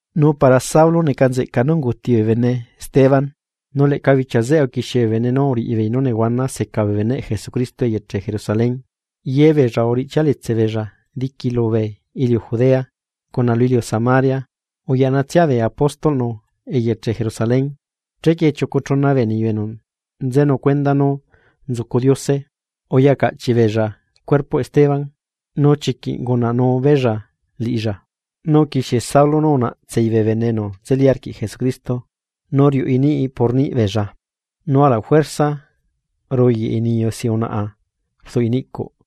Nu para Saulo neca nzeꞌca nú unguuti bee bene Esteban. Nu leꞌca bichia zeꞌe uquixie bee bene nú uriꞌibeei nú nehuana seca bee beneꞌ Jesucristo eyeche Jerusalén. Ye beella uriꞌchialetse beella diqui lubee iliu Judea, cuna lu iliu Samaria, uyaꞌnatsia bee apóstolꞌnu eyeche Jerusalén. Chequie chiucu chuna bee niyu enu nzenu cuenda nú nzucu Diose uyacaꞌchiꞌ beella cuerpoꞌ Esteban nu chiquiꞌ ungunaꞌnu beella liꞌilla. Nu uquixie Saulo nú unaꞌtsei bee bene enu nzeli arquiꞌ Jesucristo, nu riuꞌi niꞌ por niꞌ beella, nu ala juerza ruyaꞌi niyu si unaꞌa rduꞌi niꞌcuꞌ.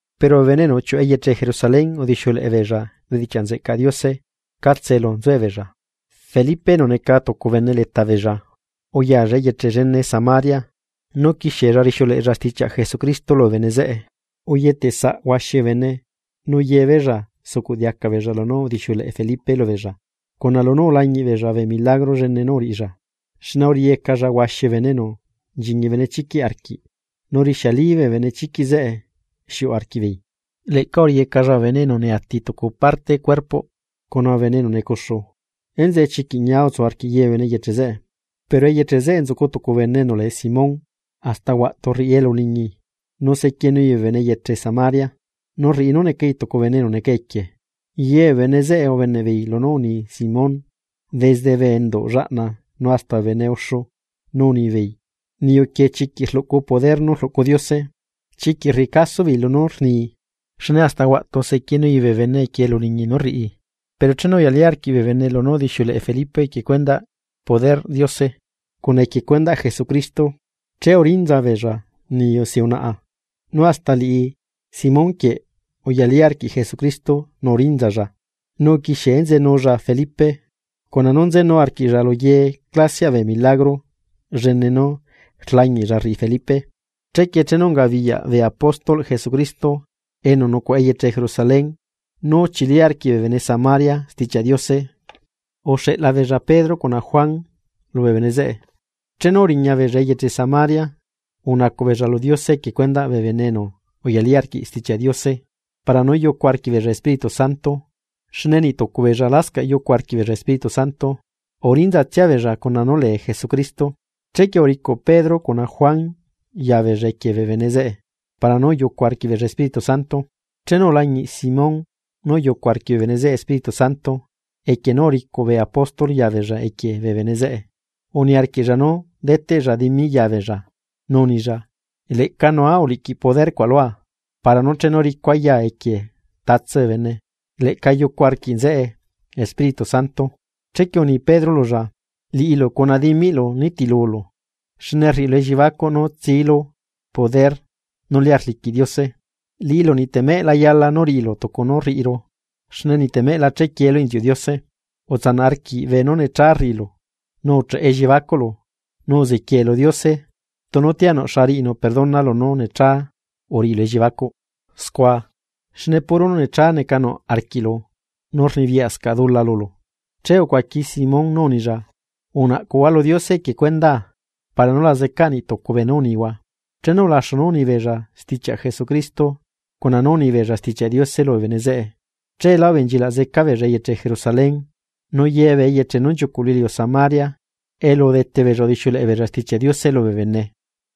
Pero bee bene enu uchiuꞌu eyeche Jerusalén udixiuleꞌe beella bedichiaꞌ nzeꞌcaꞌ Diose catse elu nzuebeella. Felipe enu neca tucu bene leta beella, uyalla eyeche llene Samaria, nu uquixiella rixiuleꞌella stichiaꞌ Jesucristo lubee bene zeꞌe. Uyetesaꞌ huaxi bee bene nu yebeella sucuꞌdiaca beella lunú udixiuleꞌe Felipe lubeella, cuna lunú ulañiꞌbeella bee milagro llene nú uriꞌilla. Xne uriꞌiyecalla huaxi bee bene enu nchiñi benechiquiꞌ arquiꞌ, nu rixiali bee benechiquiꞌ zeꞌe xiuꞌu arquiꞌbeei. Leꞌca uriꞌiyecalla bee bene enu neati tucu parte cuerpoꞌ cuna bee bene enu necuxu. Enzeꞌe chiquiꞌ ñia utsu arquiꞌ ye bee bene eyeche zeꞌe. Pero eyeche zeꞌe nzucu tucu bene enu lee Simón, hasta huaꞌtu rriꞌi elu uliñi nu sequienui bee bene eyeche Samaria, nu rriꞌi nú necai tucu bene enu neca equie. Ye bee bene zeꞌe ubeneꞌbeei lunú uni Simón, desde bee enduꞌ llaꞌna nu hasta bee bene uxu, nu unibeei: ―Niyu quieꞌ chiquiꞌ rluꞌcu poder nú rluꞌcu Diose. Chiquiꞌ rriꞌi caso beei lunú rni, xne hasta huaꞌtu sequienui bee bene equie elu uliñi nú rriꞌi. Pero chenu uyalí arquiꞌ bee bene lunú udixiuleꞌe Felipe equie cuendaꞌ poder nú rluꞌcu Diose, cuna equie cuendaꞌ Jesucristo. Che urinza beella niyu si unaꞌa. Nu hasta liꞌi Simón quieꞌ uyalí arquiꞌlla Jesucristo nu urinzalla, nu uquixie enzenulla Felipe, cuna nú nzenu arquiꞌlla lu ye clasiaꞌ bee milagro llene nú rlañiꞌlla rriꞌi Felipe. Chequie chenu ungabiyaꞌ bee apóstolꞌ Jesucristo enu nucuaꞌa eyeche Jerusalén nú uchili arquiꞌ bee bene Samaria Stichiaꞌ Diose, uxeꞌla beella Pedro cuna Juan lubee bene zeꞌe. Chenu uriñabeella eyeche Samaria, unacuꞌ beella lu Diose equie cuendaꞌ bee bene enu uyalí arquiꞌ Stichiaꞌ Diose para nú yucu arquiꞌbeella Espíritu Santo. Xne niꞌ tucu beella lascaꞌ yucu arquiꞌbeella Espíritu Santo, urinzatsia beella cuna nú lee Jesucristo. Chequie uricuꞌ Pedro cuna Juan ya beella equie bee bene zeꞌe para nú uyucu arquiꞌbeella Espíritu Santo. Chenu ulañiꞌ Simón nú uyucu arquiꞌ bee bene zeꞌe Espíritu Santo equie nú uricuꞌ bee apóstol ya beella equie bee bene zeꞌe, uniarquiꞌlla nú deteꞌlla dimi ya beella, nu unilla: ―Leꞌca nua uliꞌquiꞌ poder cuaꞌ lua para nú chenu ricua yaa equie tatse bene, leꞌca yucu arquiꞌ nzeꞌe Espíritu Santo. Chequie uni Pedro lulla: ―Liꞌilu cuna dimiꞌlu nitilulu, xne rriꞌilu elliebacuꞌ nú tsilu poder nú lia rliquiꞌ Diose. Liꞌilu niꞌtemeꞌ la yala nú riꞌilu tucu nú rriꞌiru, xne niꞌtemeꞌ la chequieelu inziuꞌ Diose. Utsanaꞌ arquiꞌ beenú necha neca rriꞌilu nu ucheꞌe elliebacuꞌlu, nu uziquiee lu Diose tunu tianuꞌ xa riꞌinu perdona lunú necha uriꞌilu elliebacuꞌ scua. Xne puro nú necha neca nuꞌ arquiꞌlu, nu rnibiyaꞌscaꞌ dula lulu. Che ucuaqui Simón nú unilla: ―Unaꞌcuhua lu Diose equie cuendaa para nú la zeca niꞌ tucu beenú unihua. Chenu ulaxu nú unibeella stichiaꞌ Jesucristo cuna nú unibeella Stichiaꞌ Diose lubee bene zeꞌe, cheelá ubenchilaꞌ zeca beella eyeche Jerusalén. Nu ye bee eyeche nú nchiucuꞌ lu iliu Samaria elu udete beella udixiuleꞌe beella Stichiaꞌ Diose lubee bene.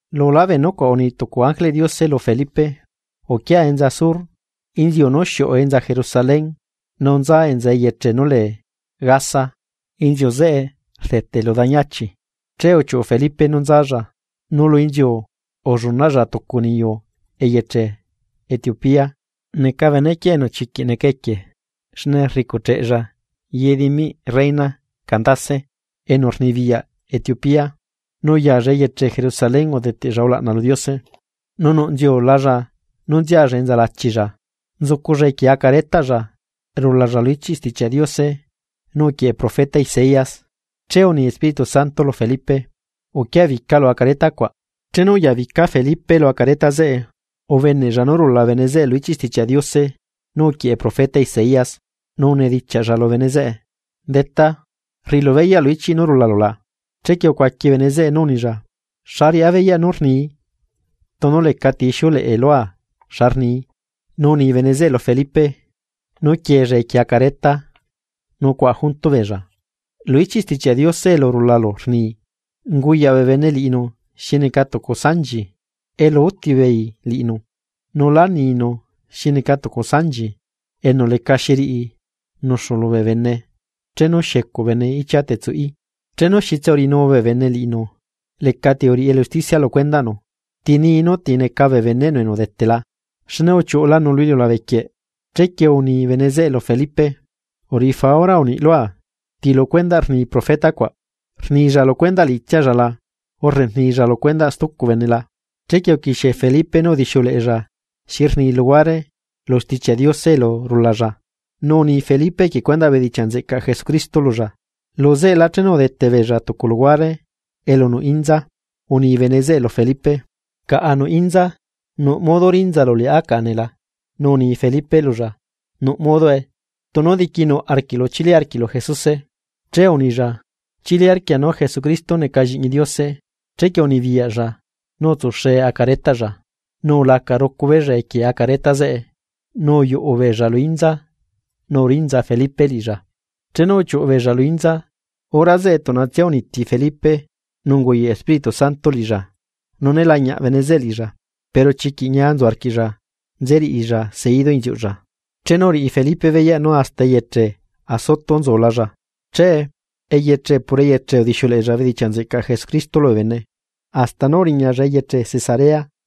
Lulá bee nucuaꞌ, uni tucu ángeleꞌ Diose lu Felipe: ―Uquia enza sur, inziu nú xiuꞌu enza Jerusalén nu nza enza eyeche nú lee Gaza. Inziu zeꞌe rdete lu dañi achi. Che uchiuꞌu Felipe nú nzalla, nu lu inziu ullunaꞌlla tucu niyu eyeche Etiopía. Neca benequieꞌ enu chiquiꞌ neca equie xne rricucheꞌella ye dimiꞌ reina Candace enu rnibiyaꞌ Etiopía, nu uyaalla eyeche Jerusalén udeteꞌlla ulaꞌna lu Diose. Nu nuꞌ nziulalla nú nzialla enza lachilla, nzuculla equie acaretaꞌlla rulalla lu ichiꞌ Stichiaꞌ Diose nú uquieꞌe profeta Isaías. Che uni Espíritu Santo lu Felipe: ―Uquiabica lu acareta cuaꞌ. Chenu uyabica Felipe lu acareta zeꞌe, ubeneꞌlla nú rula bene zeꞌe lu ichiꞌ Stichiaꞌ Diose nú uquieꞌe profeta Isaías, nu unidichiaꞌlla lu bene zeꞌe: ―¿Detá rriꞌilu beyaꞌ lu ichiꞌ nú rulalu la? Chequie ucuaqui bene zeꞌe nú unilla: ―¿Xa riꞌá beyaꞌ nú rnii, tunu lecati ixiuleꞌe lua xa rnii? Nu uni bene zeꞌe lu Felipe nú quieella equie acareta nu cuaꞌa junto beella. Lu ichiꞌ Stichiaꞌ Diose elu rulalla rni: Unguyaꞌ bee bene liꞌinu xi neca tucu sanchi, elu úti beei liꞌinu; nu lá ninu xi neca tucu sanchi enu lecaxi riꞌi nuxu lu bene chenu xiecuꞌ bene ichia tsuꞌí. Chenu xitse uriꞌinu bee bene liꞌinu. Lecati uriꞌi elu usticia lu cuendaꞌnu, ¿ti nii nú ti neca bee beneꞌnu enu udetela? Xne uchiuꞌulanu lu iliulabe quieꞌ. Chequie uni bene zeꞌe lu Felipe: ―Uriꞌi faura uniꞌ lua, ¿ti lu cuendaꞌ rni profeta cuaꞌ, rnilla lu cuendaꞌ liꞌitsialla la, urre rnilla lu cuendaꞌ stucu bene la? Chequie uquixie Felipe nú udixiuleꞌella xi rni luhuare lu Stichiaꞌ Diose elu rulalla, nu uni Felipe equie cuendaꞌ bedichiaꞌ nzeꞌcaꞌ Jesucristo lulla. Lu zeꞌelá chenu udete beella tucu luhuare elu nuꞌ inza, uni bene zeꞌe lu Felipe: ―Caꞌa nuꞌ inza, ¿nuꞌ modo rinzalu liꞌá caꞌa nee la? Nu uni Felipe lulla: ―Nuꞌ modoe, tunu diquinuꞌ arquiꞌlu chili arquiꞌlu Jesuse. Che unilla: ―Chili arquia nú Jesucristo neca Lliꞌñi Diose. Chequie unibiyaꞌlla nú utsuxe acaretaꞌlla, nu ulaca rucu beella equie acareta zeꞌe, nu uyuꞌu beella lu inza nu urinza Felipe liꞌilla. Chenu uchiuꞌu beella lu inza, hora zeꞌe tuꞌnatsia uniti Felipe nu unguyaꞌ Espíritu Santo liꞌilla, nu né lañiaꞌ bene zeꞌe liꞌilla. Pero chiquiꞌ ñia nzu arquiꞌlla nze riꞌilla seidu inziuꞌlla. Chenu uriꞌi Felipe beyaꞌ nú hasta eyeche Azoto nzulalla, che eyeche por eyeche udixiuleꞌella bedichiaꞌ nzeꞌcaꞌ Jesucristo lubee bene, hasta nú uriñalla eyeche Cesarea.